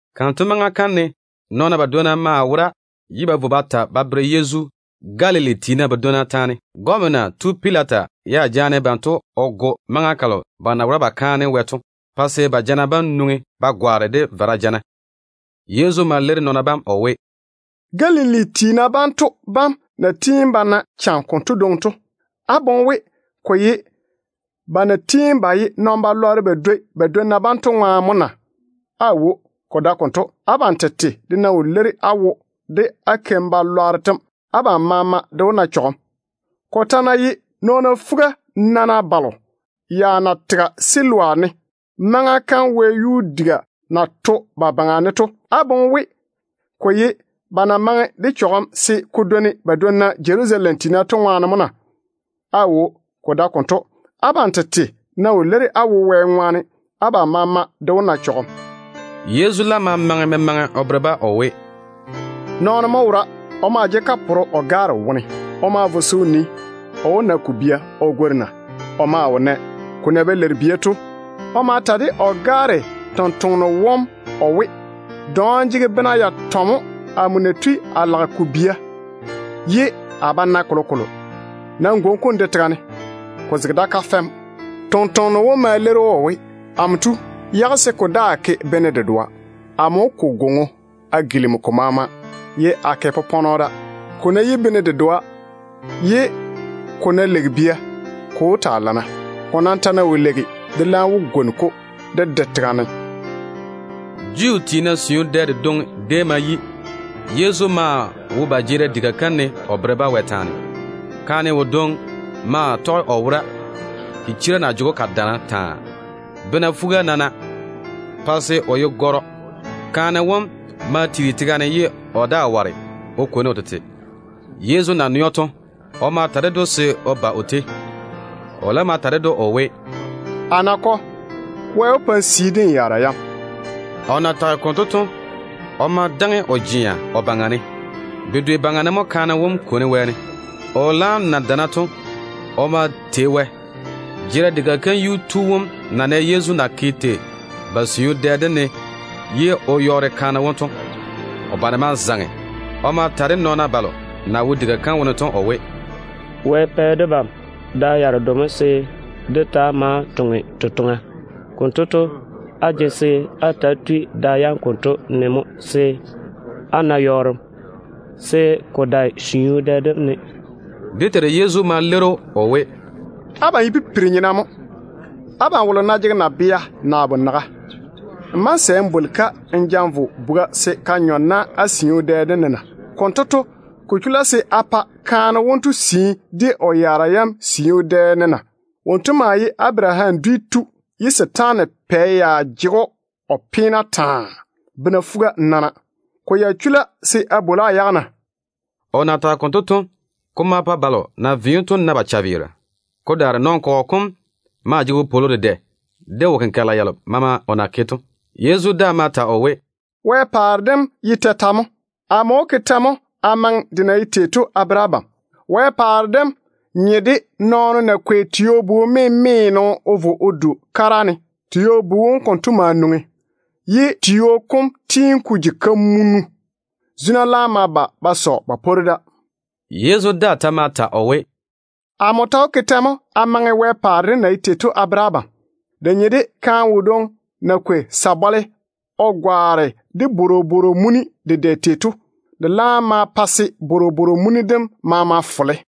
Kanto maŋa kam ne nɔɔna badwonna maa wora ye ba vo ba ta Galili tiina badwonna taane ba bere Yezu. Gɔmena tu Pilata ya jaane banto o go maŋa kalo ba na wora ba kaane Wɛ to, pa se ba jana bam nwoŋi ba gwaane de vara jana. Yezu ma leiri nɔɔna bam o we, “Galili tiina banto bam na tiini ba na cham konto dwoŋi to, á boŋe we ko ye ba na tiini ba ye nɔn-chechɔgero ba dwoi ba dwonna bam to ŋwaane mo na? Aawo, ko dae konto. Abam tete de ná wo leiri á wo de á keim-balwaaro tem, abam maama de wó na chɔgem. Ko ta ná ye nɔɔna fuga-nana balo ya na tege Siloam ne maŋa kam wɛyuu diga na to ba baŋa ne to, á boŋe we ko ye ba na maŋe de chɔgem se ko dwoni ba dwonna Jerusalem tiina to ŋwaane mo na? Aawo, ko dae konto. Abam tete ná wo leiri á wo Wɛ ŋwaane, abam maama de wó na chɔgem.” Yezu laam ma maŋe memaŋe o bere-ba o we, “Nɔɔno mo wora. O maa jege kaporo o gaare wone. O ma vo se o nii, o wó na ko bia o gwori na. O maa wo nɛ. Ko na ba leiri bia to, o ma ta de o gaare tontoŋeno wom o we, ‘Dɔɔm jege bena yatɔ mo amo na tui a lage ko bia ye a ba nae kolokolo. Nam gwoni-ko n de tega ne. Ko zege da kafɛ mo.’ Tontoŋeno wom ma leiri‑o o we, ‘Amo tu, yage se ko daa ke bene dedoa. Amo wó ko gwoŋo a gilimi ko maama ye a ke popɔnɔ da. Ko ná yi bene dedoa ye ko ná leigi bia, ko wó taa lana. Ko nam ta ná wo leigi, de laam wó gwoni-ko de de tega ne.’” Juu tiina siu dɛ dedwoŋi déem ma yi. Yezu maa wo ba jeerim diga kam ne o bere-ba Wɛ taane. Kaane wodwoŋi maa tɔge o wora, chichira na jege‑o ka daana taa, bena fuga-nana, pa se o ye gɔrɔ. Kaane wom maa tiiri tega ne ye o daa ware o kwoni o tete. Yezu na nɛ‑o to, o ma ta ded‑o se o ba o tei. O laam ma ta ded‑o o we, “A nakɔ, Wɛ wó pa n sii de n yaara yam.” O na tage konto to, o ma daŋe o jea o baŋa ne. Bedwe baŋa ne mo kaane wom kwoni wɛɛne. O laam na dana to, o ma tei Wɛ. Jeerim diga kam yuu tu wom na nɛ Yezu na ke tei ba siu dɛ dem ne ye o yɔɔre kaane wom to, o bane ma zaŋe. O ma ta de nɔɔna balo na wo diga kam wone to o we, “Wɛ pɛ debam da yaredo mo se dé taa maa toŋe totoŋa. Konto to, á jege se á ta‑á tui da yam konto ne mo se á na yɔɔrem, se ko dae siu dɛ dem ne.” Dé Teiru Yezu ma leiri‑o o we, “Abam ye pipiri-nyena mo! Abam wolo ná jege nabea naa bonaga, n bá‑n sɛ n bwoli-ka n ja n vo buga se ka nyɔ na á siu dɛ dem ne na? Konto to, ko chula se a pa kaane wonto sii de o yaara yam siu dɛ dem ne na? Wonto maa ye Abaraham dwi tu ye setaana pɛ ya jege‑o o peene taa, bena fuga-nana. Ko ya chula se a bwoli‑o a yage na?” O na tage konto to, ko ma pa balo na ve‑o to na ba chaveera. Ko daare nɔn-kɔgɔ kom maa jege wopwolo dedɛ de wo-kenkagela yalo maama o na ke to. Yezu daa ma ta o we, “Wɛ paare dem ye tetɛ mo? Amo wó ke tɛ mo a maŋe de na ye tei to a bere abam? Wɛ paare dem nye de nɔɔno na kwei tio-bu-memeeno o vo o du o kara ne. Tio-bu wom konto ma nwoŋi, ye tio kom tiini ko ji kamunu. Zuna laam ma ba ba sɔ ba pworu da.” Yezu daa ta ma ta o we, “Amo ta wó ke tɛ mo a maŋe Wɛ paare dem na ye tei to a bere abam? De nye de kaane wodwoŋi na kwei sabɔle o gwaane de bworobworo muni dedɛ tei to. De laam ma pa se bworobworo muni dem maama fole.”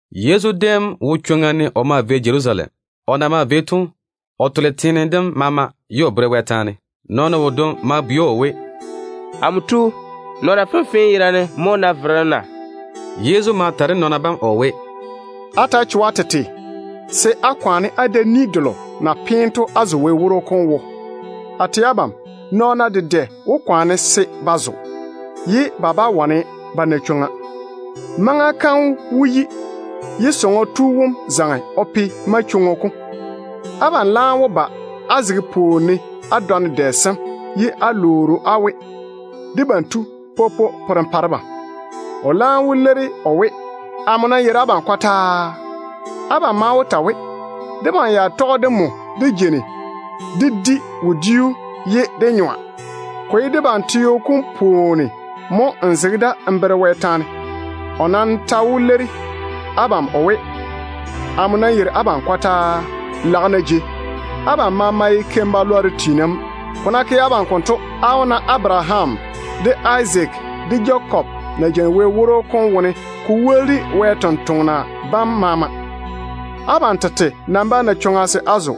Yezu déem wo chwoŋa ne o maa vei Jerusalem. O na maa vei to, o tole teene dem maama ye o bere Wɛ taane. Nɔɔno wodwoŋi ma bwei‑o o we, “Amo tu, nɔɔna fenfee yerane mo wó na verem na?” Yezu ma ta de nɔɔna bam o we, “Ta‑á cho-na á tete se á kwaane á da ni delo na peene to á zo Wɛ woro kom wo. A tɛ abam, nɔɔna dedɛ wó kwaane se ba zo, ye ba bá wane ba na chwoŋa. Maŋa kam wó yi, ye sɔŋɔ tu wom zaŋe o pe manchwoŋo kom. Abam laam wó ba á zege pwooni ne á dɔne dɛ sem ye á lwoori‑o á we, ‘Debam tu, popo, pore n pa debam.’ O laam wó leiri o we, ‘Amo nam yeiri abam kɔtaa.’ Abam maa wó ta we, ‘Debam ya tɔge de nmo dé jeini dé di wodiu ye dé nyɔa. Ko ye debam teo kom pwooni mo n zege da n bere Wɛ taane.’ O nam ta wó leiri abam o we, ‘Amo nam yeiri abam kɔtaa. Lage-na jei! Abam maama ye wo-lwan-keira mo.’ Ko ná ke abam konto, á wó na Abaraham, de Izaak, de Jakob na jeini Wɛ woro kom wone, ko woli de faŋa faŋa Wɛ sampwori sem maama. Abam tete nam bá na chwoŋa se á zo.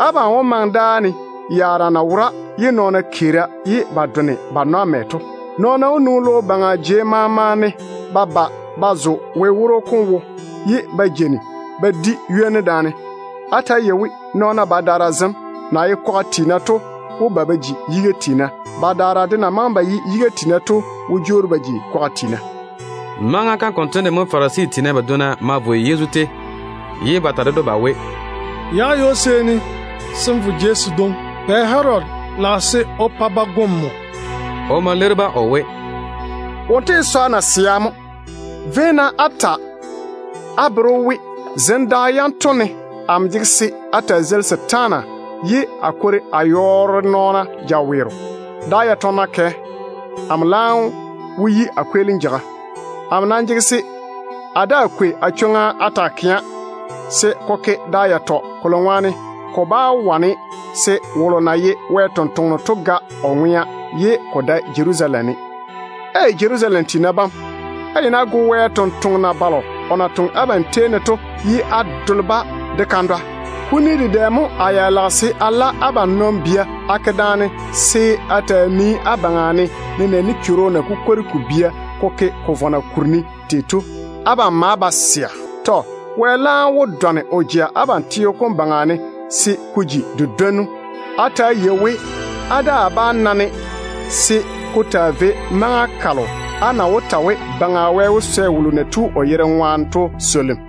Abam wó maŋe dáa ne, yaara na wora pa se nɔɔna keera ye ba done ba nwa mɛ to. Nɔɔna wó nwoŋi logo baŋa jei maama ne ba ba ba zo Wɛ woro kom wo, ye ba jeini ba di ywoni daane. Nam ta‑á yei-na we, nɔɔna badaara zem na ye kwaga tiina to wó ba ba ji yiga tiina. Badaara de na maŋe ba ye yiga tiina to wó jwoori ba ji kwaga tiina.” Maŋa kam konto ne Farisi tiina badwonna ma vo Yezu tei ye ba ta ded‑o ba we, “Yage ywo-seeni se n vo jei sedwoŋi. Pɛ Herodi lage se o pa ba go nmo mo.” O ma leiri-ba o we, “Wonto ye nasea mo! Véi-na á ta á bere‑o we, zem da yanto ne amo jege se a taa zeili setaana ye a kwori a yɔɔre nɔɔna jaweero. Da yatɔ ná kɛ, amo laam wó yi a kweelim jeiga. Amo nam jege se a daa kwei a chwoŋa a taa kɛa se ko ke da yatɔ, kolo ŋwaane ko bá wane se wolo na ye Wɛ ni-jwoŋinu to ga o ŋwea ye ko dae Jerusalem ne. Ei! Jerusalem tiina bam, á yeini á go Wɛ sampwori selo o na toŋe abam tei ne to, ye á dole-ba de kandwa. Kuni dedɛ mo a ya lage se a la abam nɔn-bia a ke daane se a taa nii á baŋa ne, nenɛɛne chworo na kukwori ko bia ko ke ko vɔna kuri ne tei to. Abam maa ba sɛa. Wɛ nam wó dɔne o jea abam teo kom baŋa ne se ko ji di-dwonnu. Á ta‑á yei we, á daa bá na-ne se ko taa vei maŋa kalo á na wó ta we, ‘Baŋa Wɛ wó swɛ wolo na tu o yere ŋwaane to swolim.’”